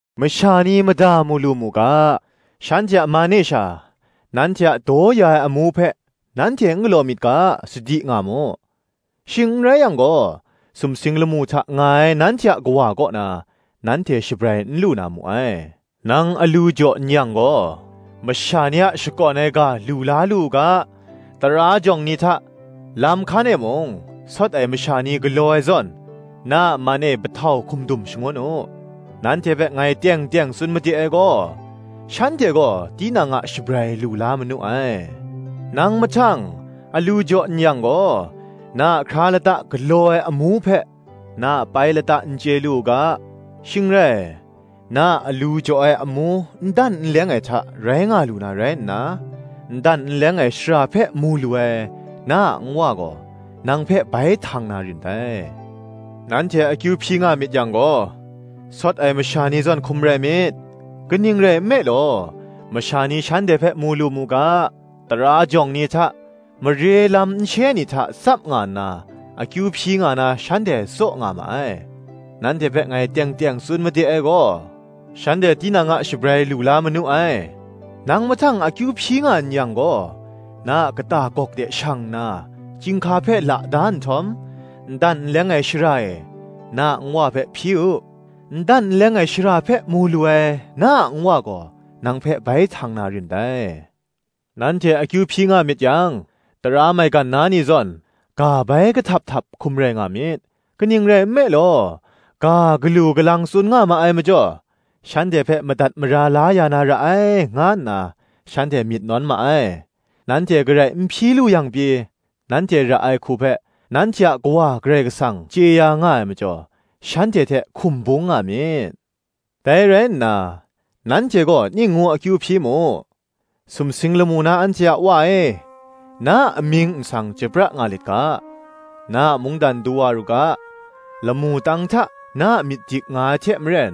Masha ni mada mu lu mu ga, shanhte a man e sha, nanhte a daw ya ai amu hpe nanhte n galaw myit ga, sadi nga mu: shing n rai yang gaw, sumsing lamu hta nga ai nanhte a Kawa kaw na, nanhte shabrai n lu na mu ai. Nang alu jaw n-yang gaw, masha ni a shakawn ai ga lu la lu u ga, tara jawng ni hta, lam hkan e mung, sawt ai masha ni galaw ai zawn, na a man e pahtau hkum dum shangun u: nanhte hpe ngai teng teng tsun made ai gaw, shanhte gaw, tinang a shabrai lu la manu ai. Nang mahtang, alu jaw n-yang gaw, na a hkra lata galaw ai amu hpe na a pai lata n chye lu u ga; shing rai, na a alu jaw ai amu n dan n leng ai hta rai nga lu na rai nna, n dan n leng ai shara hpe mu lu ai, na a Nwa gaw, nang hpe bai htang na rin dai. Nanhte akyu hpyi nga myit yang gaw, sawt ai masha ni zawn hkum rai myit: kaning rai nme law, masha ni shanhte hpe mu lu mu ga, tara jawng ni hta, mare lam nshe ni hta tsap nga nna akyu hpyi nga na shanhte tsaw nga ma ai: nanhte hpe ngai teng teng tsun made ai gaw, shanhte tinang a shabrai lu la manu ai. Nang mahtang akyu hpyi nga n yang gaw, na a kata gawk de shang nna, chyinghka hpe la da nhtawm, n dan n leng ai shara e, na a Nwa hpe hpyi u: n dan n leng ai shara hpe mu lu ai, na a Nwa gaw, nang hpe bai htang na rin dai. Nanhte akyu hpyi nga myit yang, tara maigan na ni zawn, ga bai kahtap htap hkum rai nga myit: kaning rai nme law, ga galu galang tsun nga ma ai majaw, shanhte hpe madat mara la ya na ra ai, nga nna shanhte myit nawn ma ai. Nanhte garai n hpyi lu yang pyi, nanhte ra ai hku hpe, nanhte a Kawa (Karai Kasang) chye ya nga ai majaw, shanhte hte hkum bung nga myit. Dai rai nna, nanhte gaw ning ngu akyu hpyi mu, Sumsing lamu na anhte a Wa e, Na a amying nsang chyoi pra nga lit ga; Na a mungdan du wa ru ga; Lamu tang hta, na a myit dik nga ai hte maren,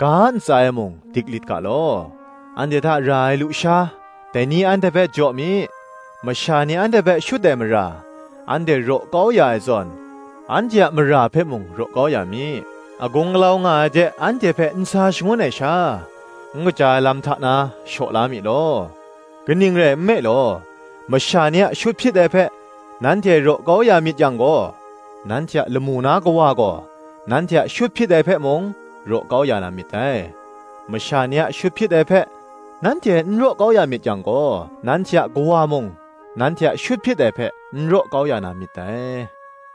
ga ntsa e mung, dik lit ga law; Anhte hta ra ai lusha, dai ni anhte hpe jaw mi; Masha ni anhte hpe shut ai mara, anhte raw kau ya ai zawn, anhte a mara hpe mung raw kau ya mi; Agung alau nga ai de, anhte hpe n sa shangun ai sha, N kaja ai lam hta na, shaw la mi law. Kaning rai nme law, masha ni a shut hpyit ai hpe nanhte raw kau ya myit yang gaw, nanhte a lamu na Kawa gaw, nanhte a shut hpyit ai hpe mung, raw kau ya na myit dai; Masha ni a shut hpyit ai hpe nanhte n raw kau ya myit yang gaw, nanhte a Kawa mung, nanhte a shut hpyit ai hpe, n raw kau ya na myit dai.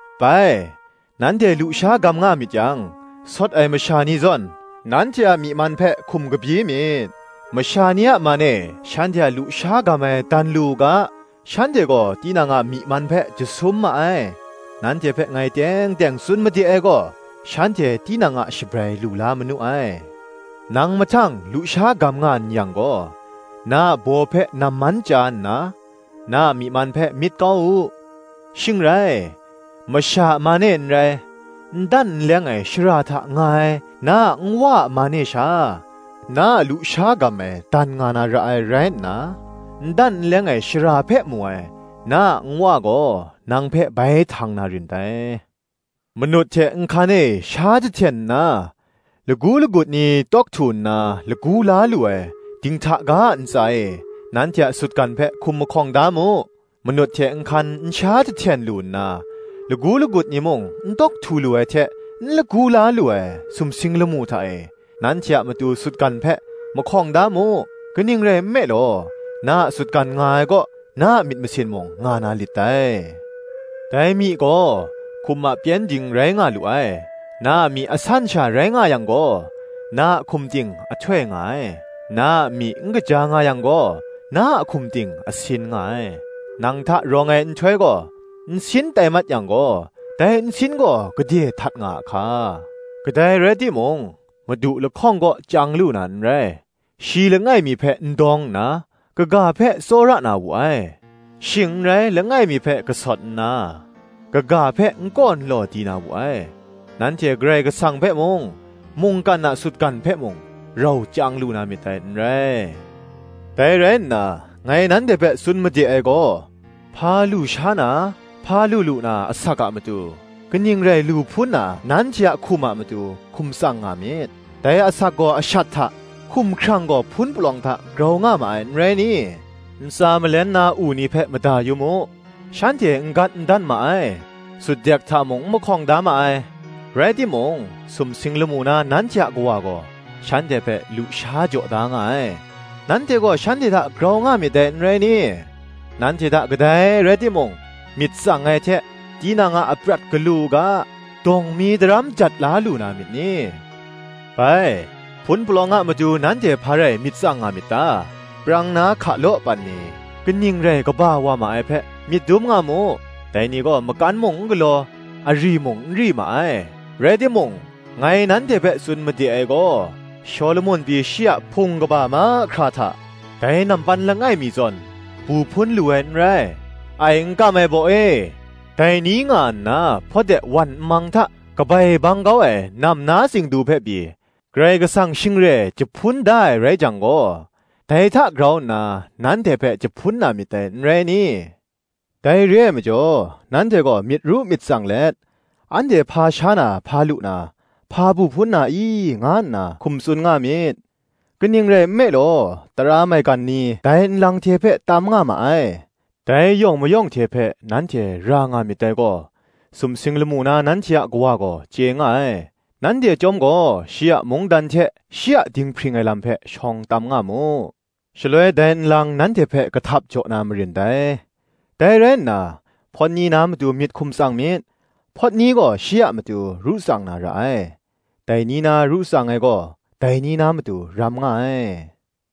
Bai, nanhte lusha gam nga myit yang, sawt ai masha ni zawn, nanhte a myi man hpe hkum kabyi myit; masha ni a man e shanhte a lusha gam ai dan lu u ga, shanhte gaw tinang a myi man hpe jasum ma ai: nanhte hpe ngai teng teng tsun made ai gaw, shanhte tinang a shabrai lu la manu ai. Nang mahtang lusha gam nga n yang gaw, na a baw hpe naman chya nna, na a myi man hpe myit kau u; Shing rai, masha a man e n rai, n dan n leng ai shara hta nga ai na a Nwa a man e sha, na a lusha gam ai dan nga na ra ai rai nna, n dan n leng ai shara hpe mu ai, na a Nwa gaw, nang hpe bai htang na rin dai. Manut hte nhkan e sha jahten nna, lagu lagut ni tawk htu nna lagu la lu ai, dinghta ga a ntsa e, nanhte a sutgan hpe hkum mahkawng da mu. Manut hte nhkan n sha jahten lu nna, lagu lagut ni mung n tawk htu lu ai hte n lagu la lu ai, sumsing lamu hta e, nanhte a matu sutgan hpe mahkawng da mu: kaning rai nme law, na a sutgan nga ai kaw, na a myit masin mung nga na lit dai. Dai myi gaw, hkum a pyengdin rai nga lu ai; na a myi asan sha rai nga yang gaw, na a hkum ting a htoi nga ai; na a myi n kaja nga yang gaw, na a hkum ting a sin nga ai: nang hta rawng ai nhtoi gaw, nsin tai mat yang gaw, dai nsin gaw gade htat nga a hka! Kadai rai ting mung, madu lahkawng kaw chyang lu na n rai; shi langai mi hpe n dawng nna kaga hpe tsawra na wu ai; shing n rai langai mi hpe kasawt nna, kaga hpe n kaw n law di na wu ai; nanhte Karai Kasang hpe mung, mungkan a sutgan hpe mung, rau chyang lu na myit dai n rai. Dai rai nna ngai nanhte hpe tsun made ai gaw, hpa lu sha na hpa lu lu na asak a matu, kaning rai lu hpun na nanhte a hkum a matu, hkum tsang nga myit; dai asak gaw ashat hta, hkumhkrang gaw hpun palawng hta grau nga ma ai, n rai ni? Ntsa malen na u ni hpe mada yu mu; shanhte n gat n dan ma ai, sutdek hta mung n mahkawng da ma ai: rai timung, sumsing lamu na nanhte a Kawa gaw, shanhte hpe lusha jaw da nga ai: nanhte gaw shanhte hta grau nga myit dai n rai ni? Nanhte hta kadai rai timung, myit tsang ai hte, tinang a aprat galu u ga, dawng mi daram jat la lu na myit ni? Bai, hpun palawng a matu nanhte hpa rai myit tsang nga myit ta? Prang na hkalaw pan ni, kaning rai kaba wa ma ai hpe, myit dum nga mu: dai ni gaw, makan mung n galaw, ari mung n ri ma ai: rai timung, ngai nanhte hpe tsun made ai gaw, Shawlumon pyi shi a hpung kaba mahkra hta, dai nampan langai mi zawn, bu hpun lu ai n rai. Ai n kam ai baw e, dai ni nga nna hpawt de wan nmang hta kabai bang kau ai nam na tsingdu hpe pyi, Karai Kasang shing re jahpun da ai rai jang gaw, dai hta grau nna nanhte hpe jahpun na myit dai, n rai ni? Dai re ai majaw nanhte gaw myit ru myit tsang let, Anhte hpa sha na, hpa lu na, hpa bu hpun na i? nga nna hkum tsun nga myit; kaning rai nme law, tara maigan ni dai nlang hte hpe tam nga ma ai: dai yawng mayawng hte hpe nanhte ra nga myit dai gaw, sumsing lamu na nanhte a Kawa gaw chye nga ai. Nanhte chyawm gaw, shi a mungdan hte shi a dinghpring ai lam hpe shawng tam nga mu; shaloi dai nlang nanhte hpe kahtap jaw na marin dai. Dai rai nna, hpawt ni na matu myit hkum tsang myit; hpawt ni gaw shi a matu ru tsang na ra ai. Dai ni na ru tsang ai gaw, dai ni na matu ram nga ai.